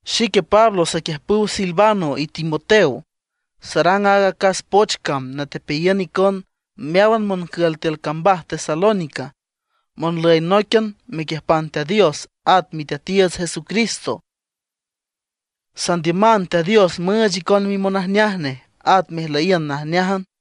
Xique Pablo saquiüjpüw Silvano y Timoteo, sarang aaga acas poch cam natepeayiün icon meáwan moncül tiül cambaj Tesalónica, monlüy nóiquian mequiüjpan Teat Dios at Miteatiiüts Jesucristo. Sandiüman Teat Dios müüch icon mimonajneaj nej, at mejlüyiün najneájan.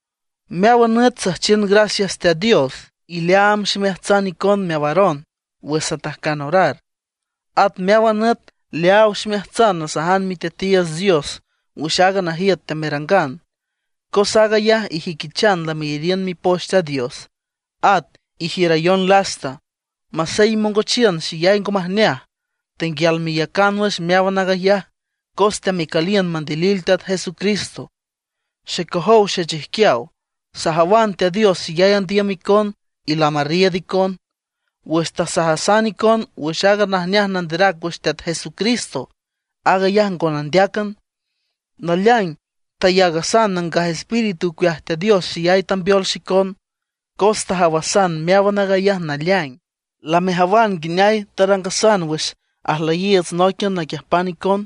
Meáwan nüt süjchiün gracias Teat Dios, y leaam ximeaats icon meawaron wüx satajcan orar. At meáwan nüt leaaw ximeajtsan nasajan Miteatiiüts Dios wüx aaga najiüt teamerangan, cos aag ayaj ijüiquichan lameyariün Mipoch Teat Dios, at ijiürayon lasta. Masey imongochiün xeyay ngo majneaj, tenguial meiücan wüx meáwan aag ayaj cos teamecüliün mandilil Teat Jesucristo. Xecojow xechijquiaw, sajawan Teat Dios xeyay andiüm icon, y lamarriiüd icon. Wüx tasajasan icon wüx aaga najneaj nanderac wüx Teat Jesucristo, aag ayaj ngo nandéacan, naleaing tayaagasan Nangaj Espíritu ocueaj Teat Dios xeyay tambeol xicon, cos tajawasan meáwan aag ayaj naleaing. Lamejawan nguineay tarangasan wüx ajlüyiiüts nóiquian naquiüjpan icon,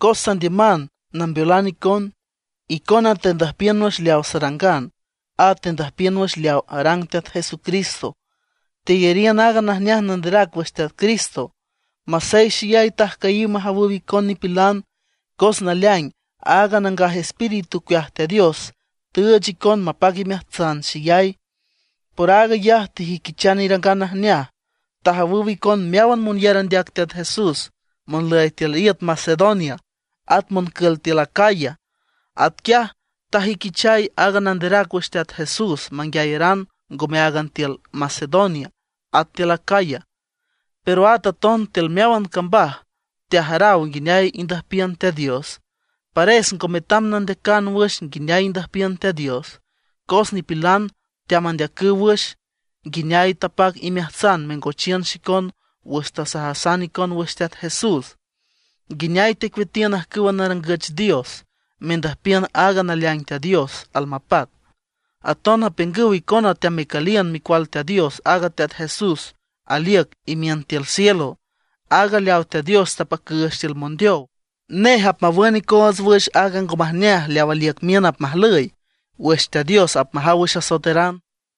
cos sandiüman nambeolan icon. Icona tendüjpiün wüx leaw sarangan, at tendüjpiün wüx leaw arang Teat Jesucristo. Teyariün aaga najneaj nanderac wüx Teat Cristo, masey xeyay tajcüyiw majawüw icon nipilan, cos naleaing aaga Nangaj Espíritu ocueaj Teat Dios tüüch icon mapac imeajtsan xeyay. Por aag ayaj tejüiquichan irangan najneaj; tajawüw icon meáwan monyar andeac Teat Jesús monlüy tiül iüt Macedonia at moncül tiül Acaya. Atquiaj tajüiquichay aaga nanderac wüx Teat Jesús manguiayaran ngome áagan tiül Macedonia y tiül Acaya, pero at aton tiül meáwan cambaj teajaraw nguineay indüjpiün Teat Dios. Pares ngo metam nandeacan wüx nguineay indüjpiün Teat Dios. Cos nipilan teamandeacüw wüx nguineay tapac imeajtsan mengochiün xicon wüx tasajasan icon wüx Teat Jesús; nguineay tecueatiün ajcüwa narangüch dios, mendüjpiün aaga naleaing Teat Dios almapac. Aton apiüngüw icona teamecüliün Micual Teat Dios, aaga Teat Jesús aliüc imiün tiül cielo, aaga leaw Teat Dios tapacüüch tiül mondeow. Nej apmawün icoots wüx aaga ngo majneaj leaw aliüc miün apmajlüy wüx Teat Dios apmajaw wüx asoeteran.